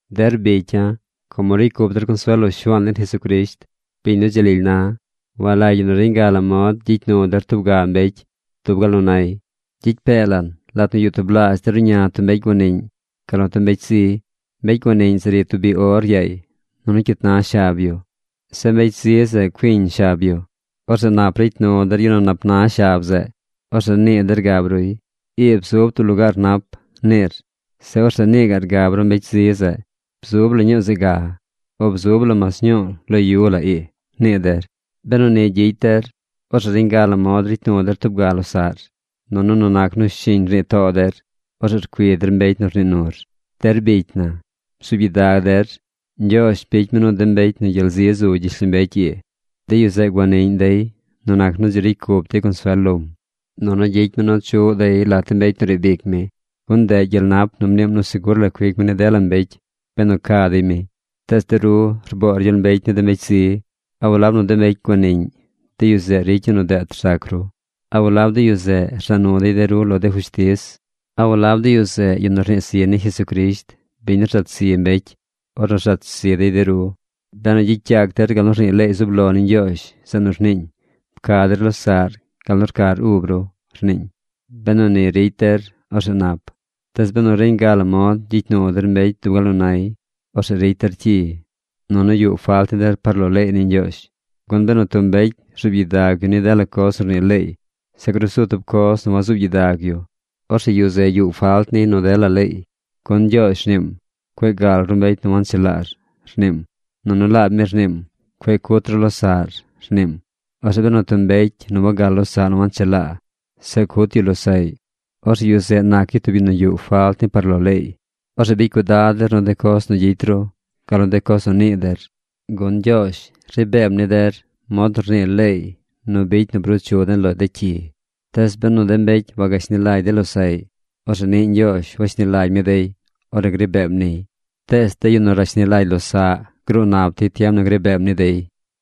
Der bicya̱, como ricy cup der consuel lo Shuaan den Jesucrisht, biñ nu dzi lily na, walagy ñi nu reñ ga la mod gyicy nu der tub ga mbecy dub gal nu na dey. Gyicy pee lan lat nu yuꞌ tublaazh der ruꞌña tub mbecy guaniꞌñ gal nu tub mbecy zi. Mbecy guaniꞌñ zeꞌ ri tub biꞌ or yaay nunu cyit na shab yu. Zeꞌ mbecy zi zeꞌ cuiñ shab yu. Orzeꞌ nap ricy nu der yu nu nap na shab zeꞌ. Orzeꞌ nii der gab ruy: “Ii bzub tub lugaar nap”, niir. Zeꞌ orzeꞌ nii gaꞌr gab ru mbecy zi zeꞌ: “Bzu la ñuu zeꞌ ga, o bzub la mas ñuu lo yu la ii”, nii der. Benu ni gyicy der, orzeꞌ reñ ga la mod ricy nu der tub ga losaꞌr, nunu nu nac nu shiñ rnii too der, orzeꞌ rcui der mbecy nu rnii nur. Der bicy na, bzuub gyidag der. Ñgyoozh bicy mi nu de mbecy nu gyel zi zu gyishlombecy ii, de yu zeꞌ guaniꞌñ dey nu nac nu dzi ricy cup dey consuel lom, nunu gyicy mi nu chuꞌ dey lat de mbecy nu riib ic mi, gun ndeꞌ gyel nap nu mniim nu segur la cuic mi ni dela mbecy benu ca dey mi. Tees de ru rboor gyel mbecy ni de mbecy zi. ¿A walab nu de mbecy guaniꞌñ, de yu zeꞌ ricy yu nu deet rzac ru? ¿A walab de yu zeꞌ rza nu dey de ru lo de fushtiz? ¿A walab de yu zeꞌ yu nu rnii zi ni Jesucrisht, biñ nu rzat zi mbecy ornu rzat zi dey de ru? Benu gyicy yac der gal nu rnii leey zub lo ni Ñgyoozh, zeꞌ nu rniiñ: “Pca der losaꞌr gal nu rcar ub ru”, rniiñ, benu ni ricy der, orzeꞌ nap. Tees benu reñ ga la mod gyicy nu der mbecy dub gal nu nay, orzeꞌ ricy der cyi, nunu yuꞌ falt ni der par lo leey ni Ñgyoozh. Gun benu tub mbecy rzuub gyidag yu ni dela coz nu rnii leey, zeꞌ grusu tub coz nu wazuub gyidag yu, orzeꞌ yu zeꞌ yuꞌ falt niy nu dela leey. Gun Ñgyoozh rniim: “Cueꞌ gal ru mbecy nu wanchelaar”, rniim. Nunu laab mi rniim: “Cueꞌ cut ru losaꞌr”, rniim. Orzeꞌ benu tub mbecy nu wagal losaꞌ nu wanchelaa, zeꞌ cut yu losaꞌy, orzeꞌ yu zeꞌ nac yu tub yu nu yuꞌ falt ni par lo leey. Orzeꞌ bicy cuidad der nu de coz nu gyicy ru, gal nu de coz nu nii der, gun Ñgyoozh ri beem ni der mod nu rnii leey nu bicy nu bruu chu den lo de cyi. Tees benu de mbecy wagashni lagy dey losaꞌy, orzeꞌ niꞌ Ñgyoozh washni lagy mi dey ornu gri beem niy. Tees de yu nu rashni lagy losaꞌ gruu nap dey tiem nu gri beem ni dey.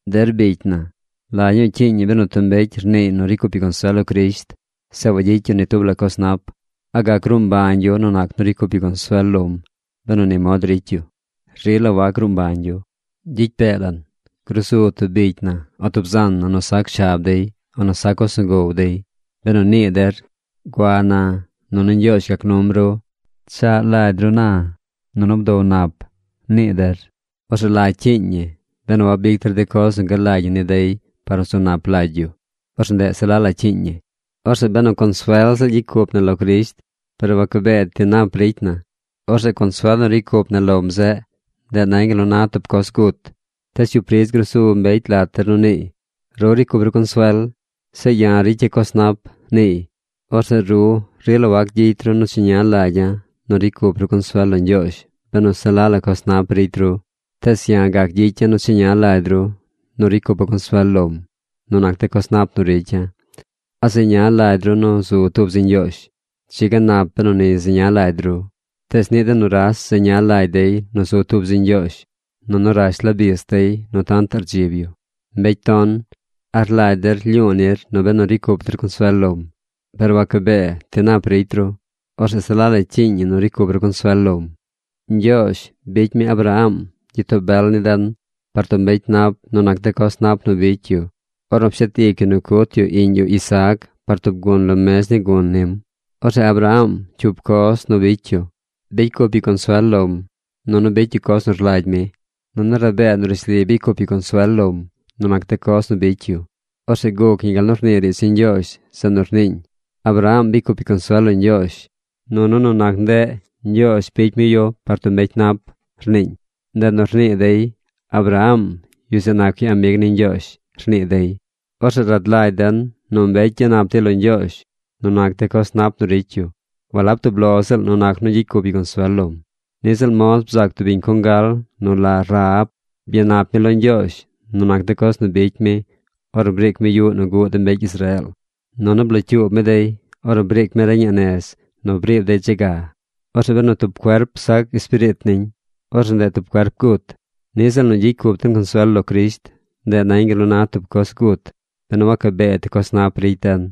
Der bicy na, ¿la ñuu cyiiñ ñi benu tub mbecy rniiy nu ricy cup yu consuel lo Crisht, zeꞌ wagyicy yu ni tub la coz nap? ¿A gac gruu mbañ yu nu nac nu ricy cup yu consuel lom benu ni mod ricy yu? Rila wac gruu mbañ yu. Gyicy pee lan grusu tub bicy na o tub zan na nu sac shab dey o nu sac coz nu gow dey. Benu nii der: “Gua na, nunu Ñgyoozh gac num ru; pchaꞌ lagy ru na, nunu bdow nap”, nii der, orzeꞌ ¿la cyiiñ ñi? Benu wabic der de coz nu galagy ñi ni dey par nu zu nap lagy yu, orzeꞌ ndeꞌ se la la cyiiñ ñi. Orzeꞌ benu consuel ziꞌl gyicy cup na lo Crisht par wacabee ti nap ricy na, orzeꞌ consuel nu ricy cup na lom zeꞌ, ndeꞌ nañ gal nu na tub coz gut. Tees cyup ridz grusu mbecy lat der nu niiy: “Ru ricy cup ru consuel. Zeꞌ ya̱ ricya̱ coz nap”, niiy. Orzeꞌ ru rila wac gyicy ru nu cheña lagya̱ nu ricy cup ru consuel lo Ñgyoozh benu se la la coz nap ricy ru. Tees ya̱ gac gyicya̱ nu cheña lagy ru nu ricy cupa̱ consuel lom nu nac de coz nap nu ricya̱. ¿A zeña lagy ru nu zu tub zi Ñgyoozh? Dzi ga nap benu ni zeña lagy ru, tees niꞌ de nuras zeña lagy dey nu zu tub zi Ñgyoozh. Nunu rash la bis dey nu tantaꞌ rdzib yu. ¡Mbecy ton! ¿A rlagy der lyu̱u̱ nir nu benu ricy cup der consuel lom, par wacabee ti nap ricy ru, orzeꞌ se la la cyiiñ ñi nu ricy cup ru consuel lom? Ñgyoozh bicy mi Abraham gyitoo bel ni den par tub mbecy nap nu nac de coz nap nu bicy yu ornu pshet ic yu nu cut yu iꞌñ yu Isaac par tub gun lo mez ni gun nim. Orzeꞌ Abraham cyup coz nu bicy yu. Bicy cup yu consuel lom, nunu bicy yu coz nu rlagy mi. Nunu rabee nu rishli bicy cup yu consuel lom nu nac de coz nu bicy yu. Orzeꞌ guc ñi gal nu rnii riidz ni Ñgyoozh zeꞌ nu rniiñ: “Abraham bicy cup yu consuel lo Ñgyoozh, nunu nu nac ndeꞌ Ñgyoozh bicy mi yu par tub mbecy nap”, rniiñ. Ndeꞌ nu rnii dey, “Abraham, yu zeꞌ nac yu amig ni Ñgyoozh”, rnii dey. Orzeꞌ rad lagy den nu mbecy gyanap dey lo Ñgyoozh nu nac de coz nap nu ricy yu, walab tub lo ziꞌl nu nac nu gyicy cup yu consuel lom. Niꞌ ziꞌl mod bzac tub biñ congal nu la Rahab. Byanap mi lo Ñgyoozh nu nac de coz nu bicy mi ornu briic mi yuꞌ nu guꞌ de mbecy Israeel, nunu blocyuub mi dey ornu briic mi reñaꞌ nez nu briib dey dze ga. Orzeꞌ benu tub cuerp sac espiriit niñ, orzeꞌ ndeꞌ tub cuerp gut. Niꞌ ziꞌl nu gyicy cup den consuel lo Crisht, ndeꞌ nañ gal nu na tub coz gut benu wacabee ti coz nap ricy den.